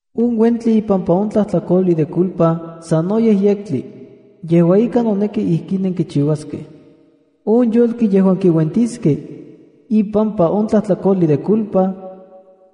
’On uentli ipampa on tlajtlakojli de culpa sanoyej yektli. Yejua ika, noneki ijkin nenkichiuaskej. On yolki yejuan kiuentiskej ipampa on tlajtlakojli de culpa,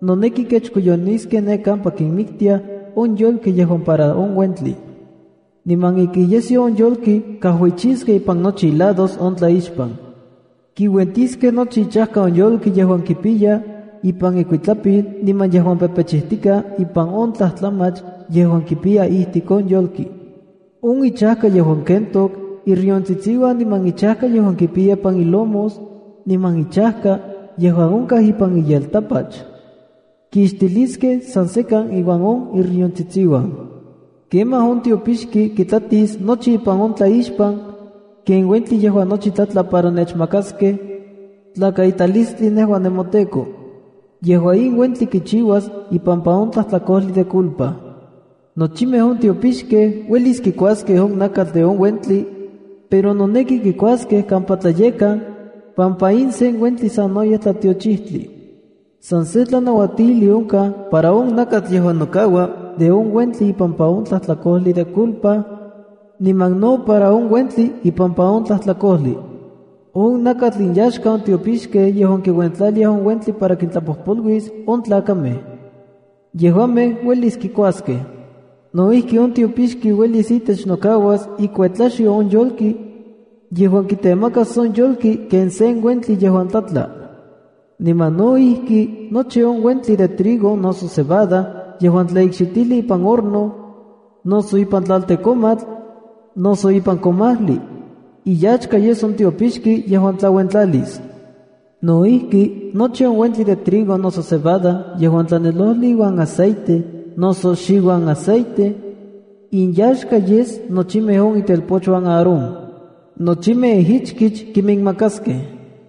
noneki kechkoyoniskej ne kampa kinmiktiaj on yolkej yejuan para on uentli. Niman ika iyesyo on yolki kajuichiskej ipan nochi ilados on tlaixpan. Kiuentiskej nochi ichajka on yolki yejuan kipiya ipan ikuitlapil niman yejuan pepechijtikaj ipan on tlajtlamach yejuan kipiya ijtik on yolki, on ichajka yejuan kentok iriontsitsiuan niman ichajka yejuan kipiya ipan ilomos, niman ichajka yejuan onkaj ipan iyeltapach kixtiliskej san sekan iuan on iriontsitsiuan. Kemaj on tiopixki kitlatis nochi ipan on tlaixpan, ken uentli yejuan nochi tlatla para nechmakaskej tlakaitalistli nejua nemoTEKO. Yejua in uentli kichiuas ipampa on tlajtlakojli de culpa. Nochimej on tiopixkej uelis kikuaskej on nakatl de on uentli, pero noneki kikuaskej kampa tlayekkan pampa in sen uentli sanoyej tlatiochijtli. ’San sen tlanauatijli onkaj para on nakatl yejuan nokaua de on uentli ipampa on tlajtlakojli de culpa, niman no para on uentli ipampa on tlajtlakojli. On nakatl inyaxka on tiopixkej yejuan kiuentlaliaj on uentli para kintlapojpoluis on tlakamej. Yejuamej uelis kikuaskej. No ijki, on tiopixki uelis itech nokauas ikuetlaxyo on yolki yejuan kitemakas on yolki ken sen uentli yejuan tlatla. Niman no ijki nochi on uentli de trigo noso cebada yejuan tlaikxitijli ipan horno, noso ipan tlaltekomatl, noso ipan komajli, iyaxka yes on tiopixki yejuan tlauentlalis. No ijki, nochi on uentli de trigo noso cebada yejuan tlanelojli iuan aceite noso xiuan aceite, inyaxka yes nochimej itelpochuan Aarón. Nochimej ijichkich kiminmakaskej.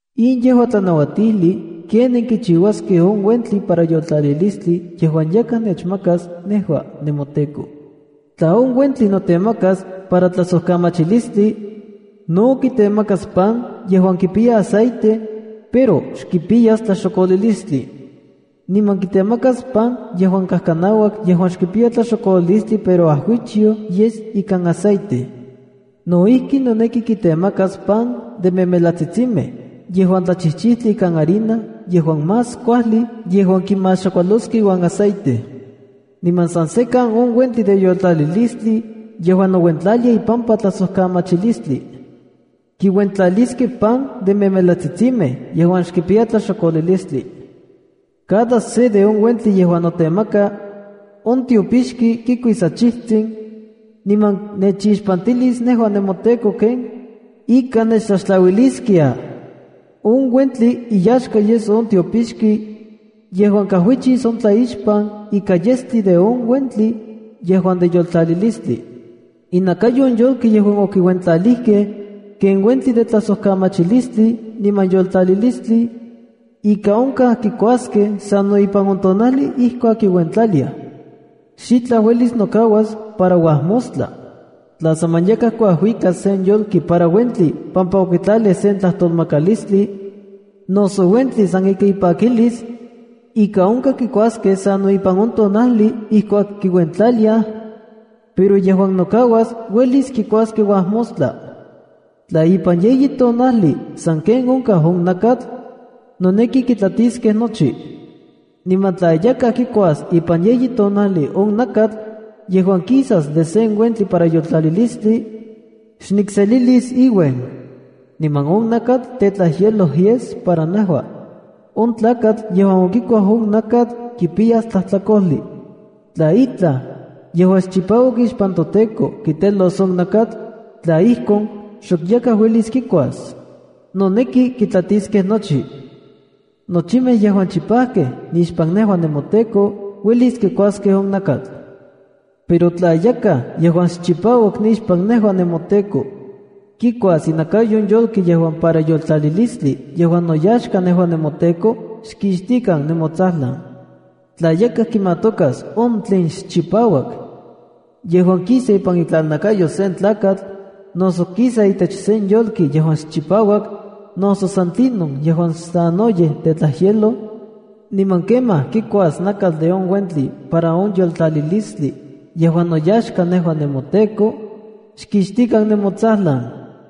’In yejua tlanauatijli ken nenkichiuaskej on uentli para yoltlalilistli yejuan yakaj nechmakas nejua nemoTEKO. Tla on uentli notemaka para tlajsojkamachilistli, no kitemakas pan yejuan kipiya aceite, pero xkipiyas tlaxokolilistli. Niman kitemakas pan yejuan kajkanauak yejuan xkipiya tlaxokolilistli pero ajuichyoj yes ikan aceite. No ijki, noneki kitemakas pan de memelatsitsimej yejuan tlachijchitli ikan harina yejuan más kuajli yejuan kimaxakualos iuan aceite. Niman san sekan on uentli de yoltalilistli yejuan nouentlaliaj ipampa tlajsojkamachilistli, kiuentlaliskej pan de memelatsitsimej yejuan kipiyas tlaxokolilistli. Cada se de on uentli yejuan notemaka, on tiopixki kikuis achijtsin, niman nechixpantilis nejua nemoTEKO ken ika nechtlaxtlauiliskiaj. On uentli iyaxka yes on tiopixki yejuan kajuichis on tlaixpan ika yestli de on uentli yejuan de yoltlalilistli. ’Inakayo on yolki yejuan okiuentlalijkej ken uentli de tlajsojkamachilistli niman yoltlalilistli, ika onkaj kikuaskej sano ipan on tonajli ijkuak kiuentlaliaj. Xitlaj uelis nokauas para uajmostla. ’Tla saman yakaj kuajuikas sen yolki para uentli pampa okitlalij sen tlajtolmakalistli, noso uentli san ika ipakilis, ika onka kikuaskej sano ipan on tonajli ijkuak kiuentlaliaj, pero yejuan nokauas uelis kikuaskej uajmostla. Tla ipan yeyi tonajli sanken onkaj on nakatl, noneki kitlatiskej nochi. Niman tla yakaj kikuas ipan yeyi tonajli on nakatl yejuan kisas de sen uentli para yoltlalilistli, xnikselilis iuen, niman on nakatl tetlajyeloj yes para nejua. On tlakatl yejuan okikuaj on nakatl, kipiyas tlajtlakojli. ’Tla itlaj yejuan xchipauak ixpan toTEKO kitelos on nakatl, tla ijkon, xok yakaj uelis kikuas. Noneki kitlatiskej nochi. “Nochimej yejuan chipajkej nixpan nejua nemoTEKO, uelis kikuaskej on nakatl. ’Pero tla yakaj yejuan xchipauak nixpan nejua nemoTEKO kikuas inakayo on yolki yejuan para yoltlalilistli yejuan noyaxka nejua nemoTEKO, xkixtikan nemotsajlan. ’Tla yakaj kimatokas on tlen xchipauak yejuan kisa ipan itlalnakayo sen tlakatl, noso kisa itech sen yolki yejuan xchipauak, noso san tlinon yejuan sanoyej tetlajyeloj, niman kemaj kikuas nakatl de on uentli para on yoltlalilistli yejuan noyaxka nejua nemoTEKO, xkixtikan nemotsajlan.”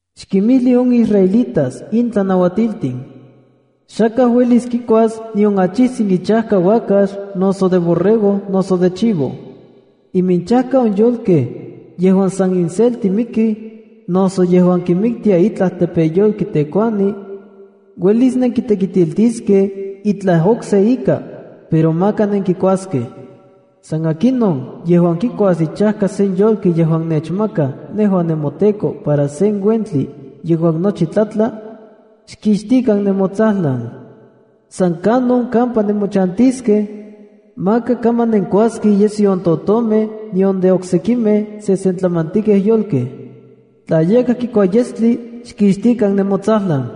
“Xkimijli on israelitas in tlanauatiltin: Xakaj uelis kikuas nion achijtsin ichajka uakax, noso de borrego noso de chivo. Iminchajka on yolkej yejuan san inselti mikij noso yejuan kinmiktia itlaj tepeyolki tekuani, uelis nenkitekitiltiskej itlaj okse ika, pero maka nenkikuaskej. ’San akinon yejuan kikuas ichajka sen yolki yejuan nechmakaj nejua nemoTEKO para sen uentli yejuan nochi tlatla, xkixtikan nemotsajlan. ’San kanon kampa nemochantiskej, maka kaman nenkuaskej iyesyo on totomej nion de oksekimej sesentlamantikej yolkej. Tla yakaj kikua yestli, xkixtikan nemotsajlan.”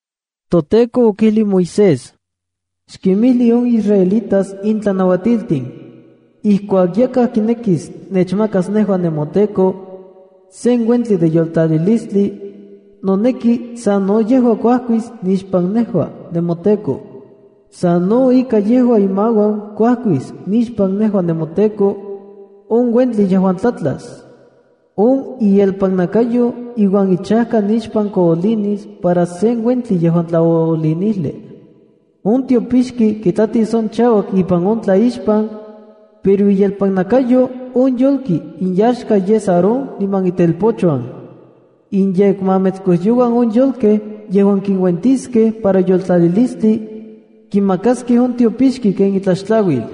ToTEKO okijli Moisés: “Xkinmijli on israelitas in tlanauatiltin: ‘Ijkuak yakaj kinekis nechmakas nejua nemoTEKO, sen uentli de yoltlalilistli, noneki sano yejua kuajkis nixpan nejua nemoTEKO. Sano ika yejua imauan kuakis nixpan nejua nemoTEKO, on uentli yejuan tlatlas. On ielpanakayo iuan ichajka nixpan koolinis para sen uentli yejuan tlaoolinijli. On tiopixki kitlatis on chauak ipan on tlaixpan, pero iyelpannakayo on yolki inyaxka yes Aarón niman itelpochuan. Inyekmametskojyouan on yolkej yejuan kinuentiskej para yoltlalilistli, kimakaskej on tiopixki ken itlaxtlauil.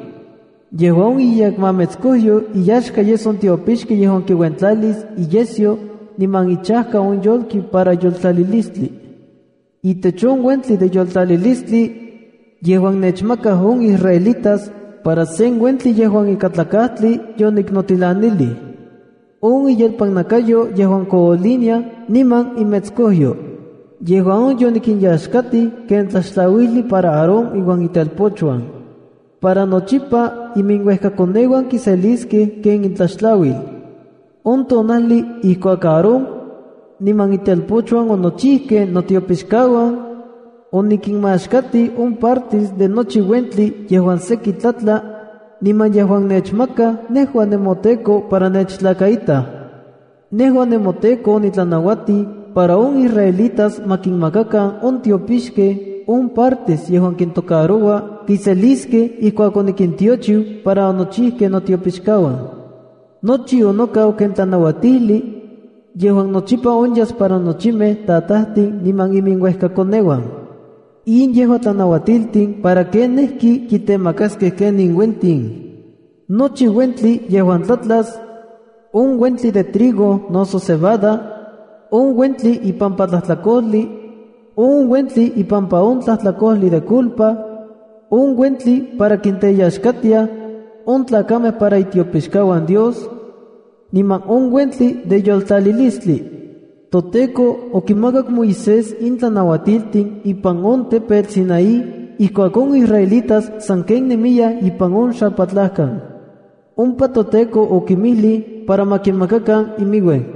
Yejua on iyekmametskojyo iyaxka yes on tiopixki yejuan kiuentlalis iyesyo niman ichajka on yolki para yoltlalilistli. Itech on uentli de yoltlalilistli yejuan nechmakaj on israelitas para sen uentli yejuan ikatlakajtli yoniknotilanilij on iyelpannakayo yejuan kooliniaj niman imetskojyo. Yejua on yonikinyaxkatij ken tlaxtlauijli para Aarón iuan itelpochuan. Para nochipa iminuejkakoneuan kiseliskej ken intlaxtlauil.” On tonajli ijkuak Aarón, niman itelpochuan onochijkej notiopixkauan, onikinmaxkatij on parte de nochi uentli yejuan seki tlatla niman yejuan nechmakaj nejua nemoTEKO para nechtlakaitaj. Nejua nemoTEKO onitlanauatij para on israelitas ma kinmakakan on tiopixkej on partes yejuan kintokaroua kiseliskej ijkuak onikintiochiu para onochijkej notiopixkauan. Nochi onokau ken tlanauatijli yejuan nochipa onyas para nochimej tatajtin niman iminuejkakoneuan. In yejua tlanauatiltin para kenijki kitemakaskej ken in uentin: nochi uentli yejuan tlatlas, on uentli de trigo noso cebada, on uentli ipampa tlajtlakojli, on uentli ipampa on tlajtlakojli de culpa, on uentli para kinteyaxkatiaj on tlakamej para itiopixkauan Dios, niman on uentli de yoltlalilistli. ToTEKO okimakak Moisés in tlanauatiltin ipan on tepetl Sinaí ijkuak on israelitas sanken nemiyaj ipan on xalpatlajkan. Ompa toTEKO okinmijlij para ma kimakakan iminuen.